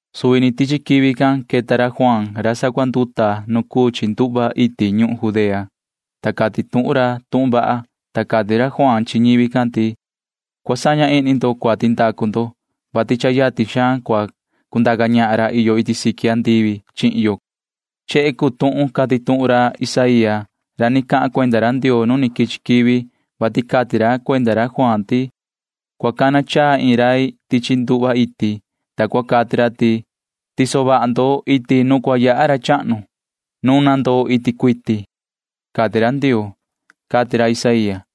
Suvi ni tichi quivi can queta ra Juaan ra sacuanduta tichi cuhu iti ñuhun Judea can, ta cati tuhun ra tuhun vaha. Cati ra Juaan can chi ñivi can ti: ―Cua saña ihni ndo cuati ndacu ndo, vati yatin xaan cua cundaca ñahan ra iyo iti siqui andivi chi yo ―cati ra. Chehe cuu tuhun cati tuhun ra Isaía ra ni cahan cuenda ra Ndioo nu quichi quivi, vati cati ra cuenda ra Juaan can ti: Cua cana chaa iin rai tichi cuhu, ta cua cati ra ti cua tiso vaha ñi iti nu cua yaha ra chahnu. Tacan ni cua tiso vaha ñi tiñu, cua cati ra, cati ra Isaía can.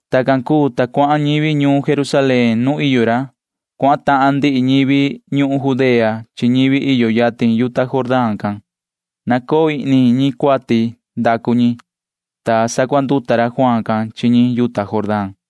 Tacan cuu, ta cuahan ñivi ñuun Jerusalén nuun iyo ra. Cuahan ndihi ñivi ñuhun Judea chi ndihi ñivi iyo yatin yuta Jordán. Nahma ñi cuati savaha ñi, ta sacuanduta ra Juaan can chi ñi yuta Jordán can.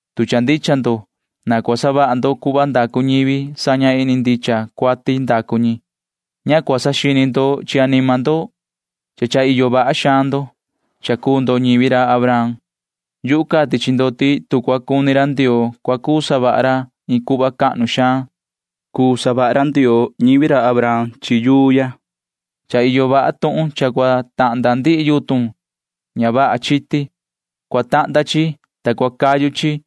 [Tu cha ndicha ndo,] na cua savaha ndo cuhva ndacu ñivi saña ihni ndicha cuati ndacu ñi. Ña cua saxini ndo chi anima ndo ti cha iyo vaha ndo, vati ñivi ndo chi ra Abraham. Yuhu cati chi ndo ti tu cua cuni ra Ndioo cua cuu savaha ra iin cuhva cahnu xaan. Cua cuu sama ra yuu ya, ta cuu chi ñivi ra Abraham. Cha iyo vaha tuhun cha cua tahnda ndihi yutun ña vaha chiti. Cua tahnda chi, ta cua cayu chi tichi ñuhun,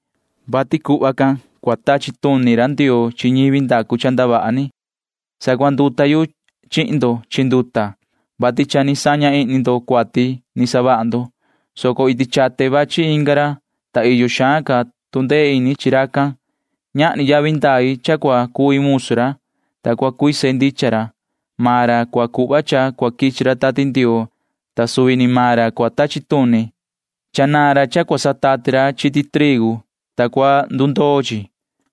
[vati cuhva cua tachi tuni ra Ndioo chi ñivi ña vaha cuu chi]. Sacuanduta yu chihin ndo chi nduta, vati cha ni saña ihni ndo cuati savaha ndo, soco iti chate vachi inga ra, ta iyo xaan ca tu ndee ini chi ra. Ñahni yavi ndai cha cua cui musu ra, ta cua cuise ndichan ra. Maan ra cua cuhva cha cua quichi ra Tati Ndioo, ta suvi ra cuu ra cua tachi tuni. Cha iyo vaha ra cha cua sandundoo ra nu cua satati ra chiti trigu can.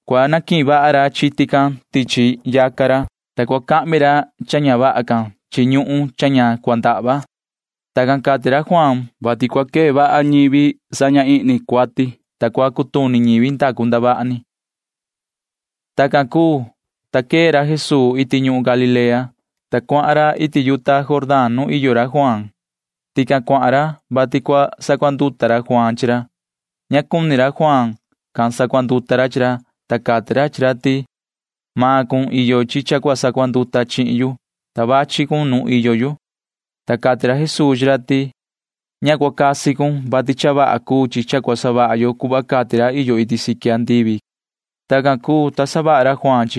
Cua canihin vaha ra chiti can tichi yaca ra, ta cua cahmi ra cha ña vaha can chi ñuhun ña ndahva. [Tacan cati ra Juaan can, vati cua quee vaha ñivi saña ihni cuati, ta cua cutuni ñivi ni vii ndacu cuati.] Tacan cuu, ta quee ra Jesuu iti ñuhun Galilea, ta cuahan ra iti yuta Jordán nuun iyo ra Juaan can. Tican cuahan ra, vati cua sacuanduta ra Juaan chi ra. Ña cuni ra Juaan can sacuanduta ra chi ra, ta cati ra chi ra ti: ―Nini ca cha cua sacuanduta cun chi yuhu, ta cha vachi cun iti nuin ―cati ra. Ta cati ra Jesuu chi ra ti: ―Ña cua casi cun, vati cha vaha cuu cha cua savaha yo cuhva cati ra iyo iti siqui andivi ―cati ra. Tacan cuu, ta chaha ra Juaan.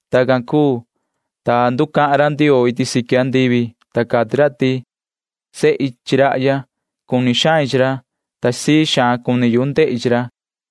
Tacan cuu, ta nducahan ra Ndioo iti siqui andivi, ta cati ra ti: ―Sehi chi rahya. Cuni xain chi ra, ta sii xaan cuni yu ndehi chi ra ―cati ra.